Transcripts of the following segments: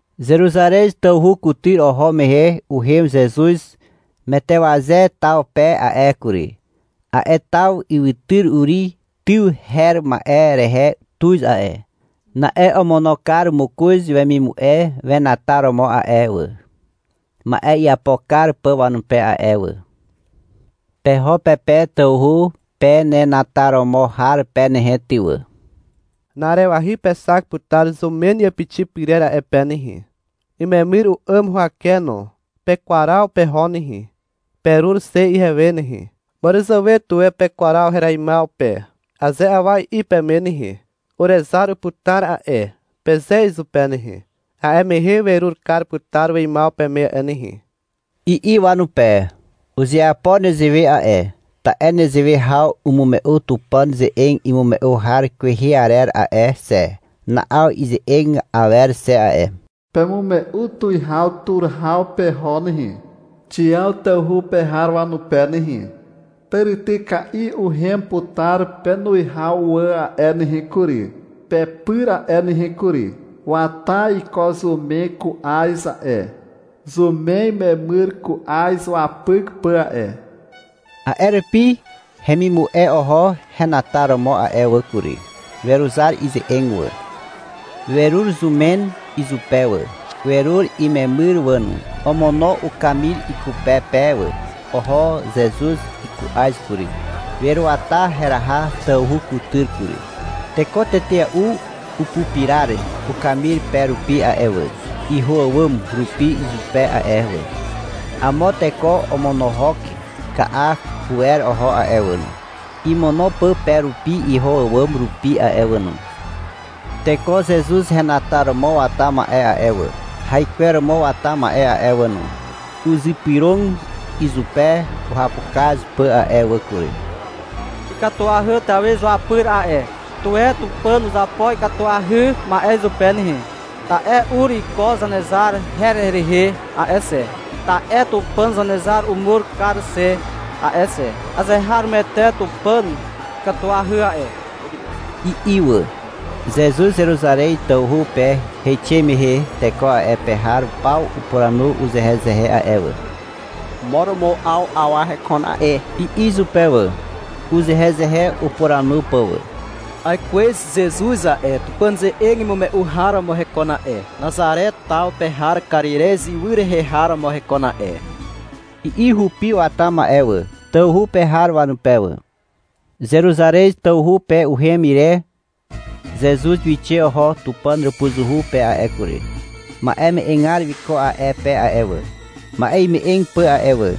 Zeruzarez tawhu kutyr oho mehe uhem Zezuz Metewaze taw pe a'e kury. A'e taw ywytyr Uri tyw her ma'e rehe tuz a'e. Na'e omono kar mokoz wemimu'e wenataromo a'e wà, ma'e iapo kar pà wanupe a'e wà. — Peho pe pe tawhu penenataromo har pe nehe ty wà. Na'arewahy pexak putar zumen iàpixi pyrer a'e pe nehe. Imemyr u'àm huwake no. Pekwaraw peho nehe. Perur xe ihewe nehe. — Màràzàwe tuwe pekwaw hereimaw pe, aze awa i'i peme nehe, — Urezar uputar a'e, peze izupe nehe. A'e mehe werur kar putar weimaw peme a'e nehe, i'i wanupe. Uzeapo nezewe a'e, ta'e nezewe haw umume'u Tupàn ze'eg imume'u har kwehe arer a'e xe. Na'aw ize'eg awer xe a'e. Pemume'u tuwihaw tur haw peho nehe, Xiàw tawhu pe har wanupe nehe. Tàrityka'i uhem putar penuwihaw wà a'e nehe kury, pepyr a'e nehe kury. Wata iko zumen ku'az a'e. Zumen imemyr ku'az wapyk pà a'e. A'e rupi hemimu'e oho henataromo a'e wà kury. Weruzar ize'eg wà. Werur zumen izupe wà, werur imemyr wà no. Omono ukamir ikupe pe wà. Oho Zezuz iku'az kury. Weruata heraha tawhu kutyr kury. Teko tetea'u upupirar ukamir pe rupi a'e wà, iho àwàm rupi izupe a'e wà. Amo teko omonohok ka'a huwer oho a'e wà no, imono pà pe rupi iho àwàm rupi a'e wà no. Teko Zezuz henataromo wata ma'e a'e wà, haikweromo wata ma'e a'e wà no, uzypyrog izupe uhapukaz pà a'e wà kury. — Ikatuahy Tawi izuapyr a'e. Tuwe Tupàn uzapo ikatuahy ma'e izupe nehe, ta'e ur iko Zanezar her rehe a'e xe. (Ta'e Tupàn Zanezar umur kar xe a'e xe.) Azeharomoete Tupàn ikatuahy a'e, i'i wà. Zezuz Zeruzarez tawhu pe heixe mehe teko a'e pe har paw upuranu uzehezehe a'e wà. — Mo romo 'aw awa hekon a'e, i'i izupe wà, uzehezehe upuranu pà wà. — Aikwez Zezuz a'e, Tupàn ze'eg imume'u har romo hekon a'e, Nazare taw pe har Karirez ywy rehe har romo hekon a'e, i'i hupi wata ma'e wà, tawhu pe har wanupe wà. Zeruzarez tawhu pe uhem ire Zezuz wixe oho Tupàn hàpuzuhu pe a'e kury. Ma'e me'egar wiko a'e pe a'e wà, ma'e ime'eg pà a'e wà.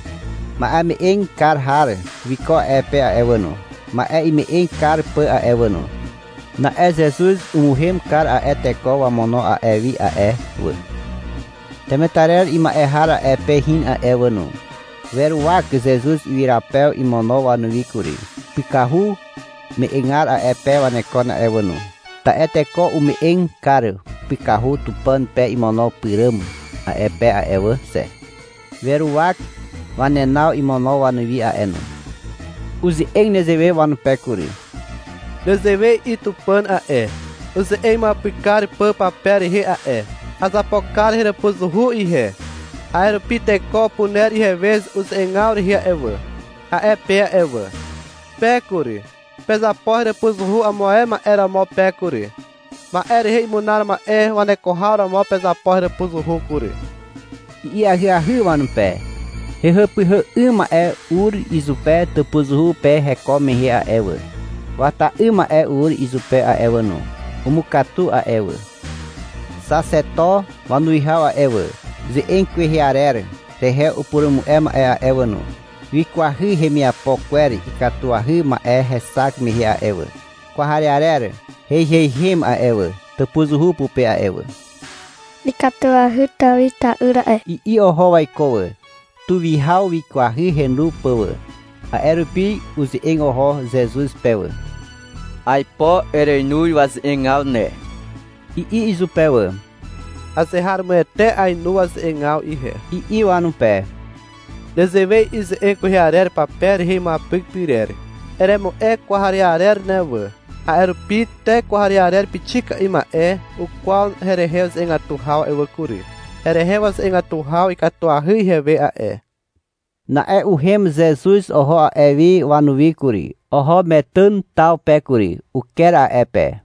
Ma'eme'eg kar har wiko a'e pe a'e wà no, ma'e ime'eg kar pà a'e wà no. Na'e Zezuz umuhem kar a'e teko wamono a'e wi a'e wà. Temetarer ima'e har a'e pe hin a'e wà no. Weruwak Zezuz ywyrapew imono wanuwi kury. Pykahu me'egar a'e pe wanekon a'e wà no. Ta'e teko ume'eg kar pykahu Tupàn pe imono pyràm a'e pe a'e wà xe. Weruwak wanenaw imono wanuwi a'e no. Uze'eg nezewe wanupe kury. — Nezewe i'i Tupàn a'e, uze'eg imuapyk kar pà pape rehe a'e. — Azapo kar heràpuzuhu ihe. A'e rupi teko upuner ihewe uze'egaw rehe a'e wà, a'e pe a'e wà. Pe kury, pezapo heràpuzuhu amo ae ma'e romo pe kury. Ma'e rehe imunar ma'e waneko haw romo pezapo heràpuzuhu kury, i'i ahyahy wanupe. Hehàpyhà 'ym ma'e ur izupe tàpuzuhu pe heko mehe a'e wà. Wata 'ym ma'e ur izupe a'e wà no. Umukatu a'e wà. Xaxeto wanuwihaw a'e wà, ze'eg kwehe arer rehe upurumu'e ma'e a'e wà no, wikwahy hemiapo kwer ikatuahy ma'e hexak mehe a'e wà. Kwarearer heiheihem a'e wà, tàpuzuhu pupe a'e wà. — Ikatuahy Tawi ta'yr a'e, i'i oho waiko wà. Tuwihaw wikwahy henu pà wà. A'e rupi uze'eg oho Zezuz pe wà. — Aipo ereinu waze'egaw ne, i'i izupe wà. — Azeharomoete ainu waze'egaw ihe, i'i wanupe. — Nezewe i'i ze'eg kwehe arer pape rehe imuapyk pyrer. — Eremu'e kwarearer ne wà. A'e rupi te kwarearer pixika'i ma'e ukwaw herehe uze'egatu haw a'e wà kury. Herehe waze'egatu haw ikatuahy ihewe a'e. Na'e uhem Zezuz oho a'e wi wanuwi kury. Oho Metàn taw pe kury. Uker a'e pe.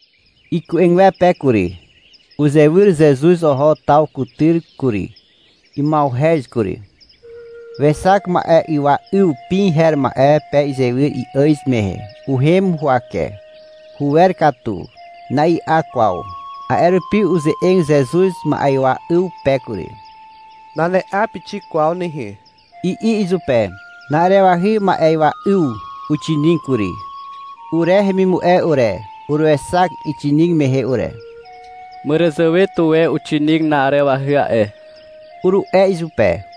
Iku'egwepe kury. Uzewyr Zezuz oho taw kutyr kury. Ima'uhez kury. Wexak ma'ywa 'yw pi her ma'e pe izywyr i'àz mehe. Uhem huwake. Huwer katu. Na'i'a kwaw. A'e rupi uze'eg Zezuz ma'ywa 'yw pe kury. — Nane'a pixik kwaw nehe, i'i izupe. Na'arewahy ma'ywa 'yw uxinig kury. Ure hemimu'e ure, uruexak ixinig mehe ure. — Màràzàwe tuwe uxinig na'arewahy a'e, uru'e izupe.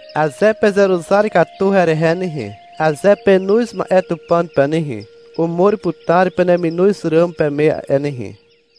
Aze pezeruzar katu herehe nehe, aze penoz ma'e Tupàn pe nehe, umur putar peneminoz ràm peme a'e nehe.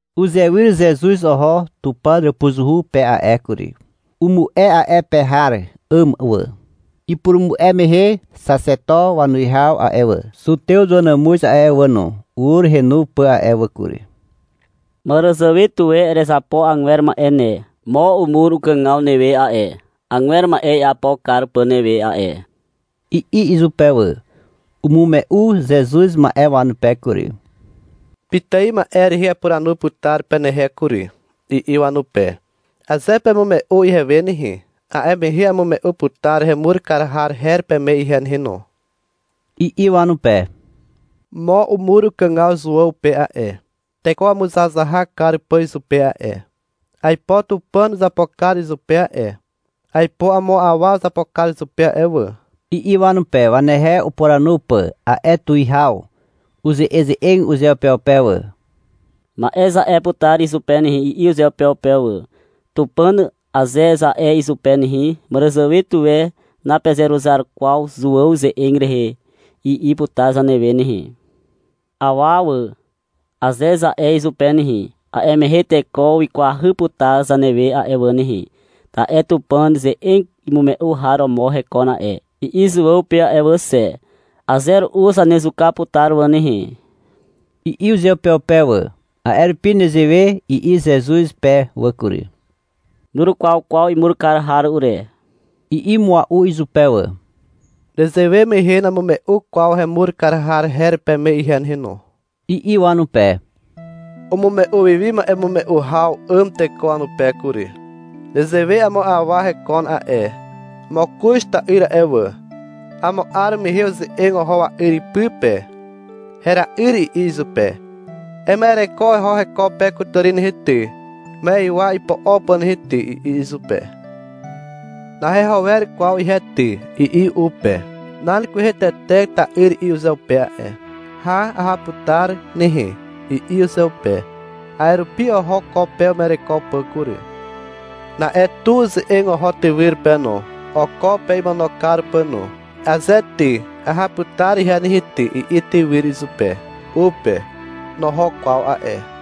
Uzewyr Zezuz oho Tupàn hàpuzuhu pe a'e kury. Umu'e a'e pe har 'àm wà. Ipurumu'e mehe xaxeto wanuwihaw a'e wà, Zutew wanàmuz a'e wà no, ur henu pà a'e wà kury. — Màràzàwe tuwe erezapo agwer ma'e ne. Mo umur ukàgaw newe a'e, agwer ma'e iapo kar pà newe a'e, i'i izupe wà. Umume'u Zezuz ma'e wanupe kury. — Pitài ma'e rehe apuranu putar penehe kury, i'i wanupe. — Aze pemume'u ihewe nehe, a'e mehe amume'u putar hemur kar har her peme ihe nehe no, i'i wanupe. — Mo umur ukàgaw Zuàw pe a'e, teko wamuzahazahak kar pà izupe a'e. Aipo Tupàn uzapo kar izupe a'e. Aipo amo awa uzapo kar izupe a'e wà, i'i wanupe, wanehe upuranu pà. A'e tuwihaw uze'eze'eg uzeupeupe wà. — Ma'e za'e putar izupe nehe, i'i uzeupeupe wà. — Tupàn, aze za'e izupe nehe, — Màràzàwe tuwe napezeruzar kwaw Zuàw ze'eg rehe, i'i putar zanewe nehe. — Awa wà, aze za'e izupe nehe, a'e mehe teko wikwahy putar zanewe a'e wà nehe. Ta'e — Tupàn ze'eg imume'u har romo hekon a'e, i'i Zuàw pe a'e wà xe. Aze ru'u zanezuka putar wà nehe, i'i uzeupeupe wà. A'e rupi nezewe i'i Zezuz pe wà kury. — Nurukwaw kwaw imur kar har ure, i'i mua'u izupe wà. — Nezewe mehe namume'u kwaw hemur kar har her peme ihe nehe no, i'i wanupe. Umume'u wi wi ma'emume'u haw 'àm teko wanupe kury. — Nezewe amo awa hekon a'e. Mokoz ta'yr a'e wà. Amo 'ar mehe uze'eg oho wa'yr ipy pe. — Hera'yr, i'i izupe. — Ema'ereko eho heko pe kutàri nehe ty, ma'ywa ipo'o pà nehe ty, i'i izupe. — Naheho wer kwaw ihe ty, i'i u pe. Nan kwehe tete ta'yr i'i uzeupe a'e. — Hà, aha putar nehe, i'i uzeupe. A'e rupi oho ko pe uma'ereko pà kury. Na'e tu uze'eg oho tywyr pe no, oko pe imono kar pà no. — Aze ty, aha putar ihe nehe ty, i'i tywyr izupe, u pe. Noho kwaw a'e.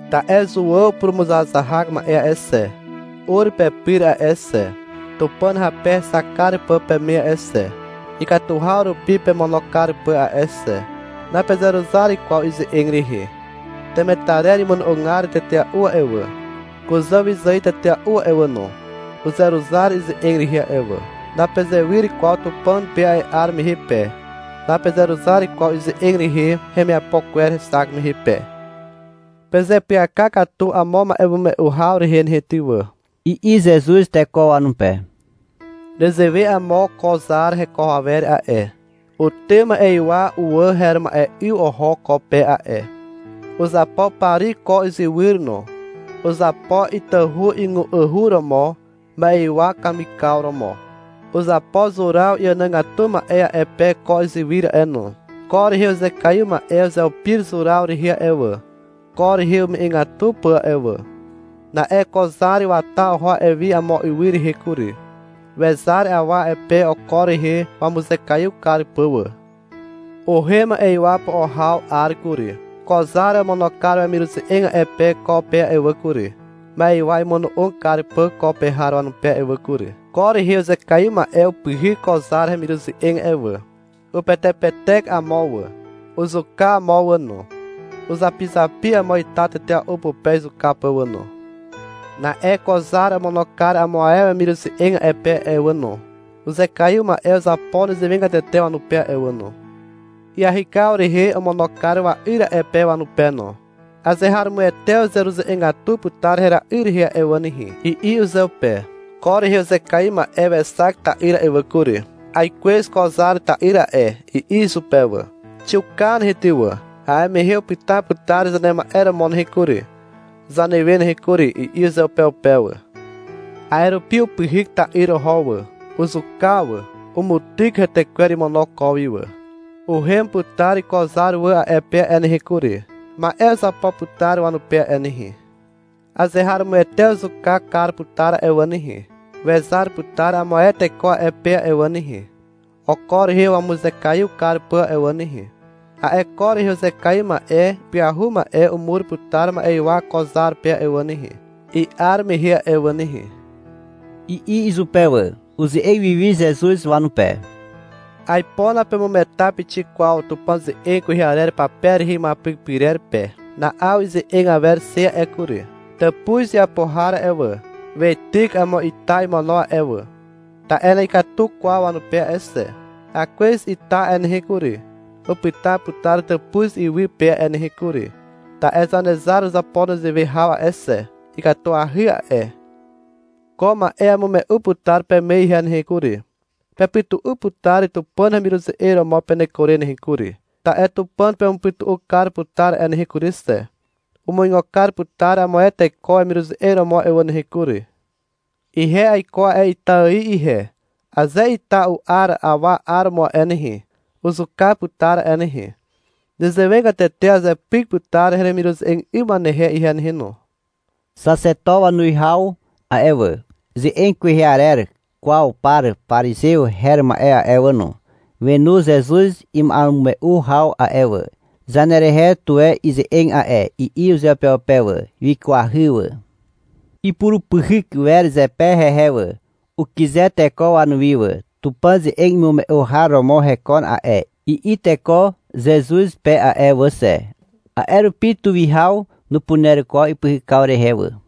Ta'e Zuàw purumuzahazahak ma'e a'e xe, ur pepyr a'e xe, Tupàn hape hexak kar pà peme a'e xe, ikatu haw rupi pemono kar pà a'e xe. Napezeruzar kwaw ize'eg rehe. Temetarer imono'ogar tetea'u a'e wà, kuzà wyzài tetea'u a'e wà no, uzeruzar ize'eg rehe a'e wà. Napezewyr kwaw Tupàn pe a'e 'ar mehe pe. Napezeruzar kwaw ize'eg rehe hemiapo kwer hexak mehe pe. — Pezeapyaka katu amo ma'emume'u haw rehe nehe ty wà, i'i Zezuz teko wanupe. — Nezewe amo ko zar heko awer a'e. Utym ma'ywa uwà her ma'e 'yw oho ko pe a'e. Uzapo pari ko izywyr no. Uzapo itahu ygu'ahu romo, ma'ywa kamikaw romo. Uzapo zuraw iànàgatu ma'e a'e pe ko izywyr a'e no. Ko rehe uzekaiw ma'e uzeupir zuraw rehe a'e wà, ko rehe ume'egatu pà a'e wà. Na'e ko zar wata oho a'e wi amo ywy rehe kury. Wezar awa a'e pe oko rehe wamuzekaiw kar pà wà. Uhem ma'ywa po'o haw 'ar kury. Ko zar omono kar wemiruze'eg a'e pe ko pe a'e wà kury, ma'ywa imono'og kar pà ko pe har wanupe a'e wà kury. Ko rehe uzekaiw ma'e upyhyk ko zar hemiruze'eg a'e wà. Upetepetek amo wà, uzuka amo wà no, uzapizapi amo ita tetea'u pupe izuka pà wà no. Na'e ko zar omono kar amo ae wemiruze'eg a'e pe a'e wà no. Uzekaiw ma'e uzapo nezewegatete wanupe a'e wà no. Iahykaw rehe omono kar wa'yr a'e pe wanupe no. — Azeharomoete uzeruze'egatu putar hera'yr rehe a'e wà nehe, i'i uzeupe. Ko rehe uzekaiw ma'e wexak ta'yr a'e wà kury. — Aikwez ko zar ta'yr a'e, i'i izupe wà. — Xiuka nehe ty wà, a'e mehe upyta putar zanema'e romo nehe kury, zanewe nehe kury, i'i uzeupeupe wà. A'e rupi upyhyk ta'yr oho wà. Uzuka wà. Umutyk hetekwer imono ko wi wà. Uhem putar ko zar wà a'e pe a'e nehe kury. Ma'e uzapo putar wanupe a'e nehe. Azeharomoete uzuka kar putar a'e wà nehe. Wezar putar amo ae teko a'e pe a'e wà nehe, oko rehe wamuzekaiw kar pà a'e wà nehe. A'e ko rehe uzekaiw ma'e ipyahu ma'e umur putar ma'ywa ko zar pe a'e wà nehe, i'ar mehe a'e wà nehe, i'i izupe wà. Uze'eg wiwi Zezuz wanupe. — Aipo napemugeta pixik kwaw Tupàn ze'eg kwehe arer pape rehe imuapyk pyrer pe. Na'aw ize'eg awer xe a'e kury. Tàpuz iapo har a'e wà, Weityk amo ita imono a'e wà. Ta'e na'ikatu kwaw wanupe a'e xe. Akwez ita a'e nehe kury, upyta putar tàpuz iwy pe a'e nehe kury. Ta'e Zanezar uzapo nezewe haw a'e xe. Ikatuahy a'e. Ko ma'e amume'u putar peme ihe nehe kury. Pepytu'u putar Tupàn hemiruze'eg romo peneko re nehe kury, ta'e Tupàn pemupytu'u kar putar a'e nehe kury xe. Umuigo kar putar amo ae teko wemiruze'eg romo a'e wà nehe kury. Ihe aiko a'e ita ài ihe. Aze ita u'ar awa 'aromo a'e nehe, uzuka putar a'e nehe. Nezewegatete azepyk putar heremiruze'eg 'ym wanehe ihe nehe no. Xaxeto wanuwihaw a'e wà, ze'eg kwehe arer kwaw par parizew her ma'e a'e wà no, wenu Zezuz ima'emume'u haw a'e wà. — Zanerehe tuwe ize'eg a'e, i'i uzeupeupe wà. Wikwahy wà. Ipurupyhyk wer zepe hehe wà. Ukyze teko wanuwi wà. — Tupàn ze'eg imume'u har romo hekon a'e, i'i teko Zezuz pe a'e wà xe. A'e rupi tuwihaw nupuner kwaw ipyhykaw rehe wà.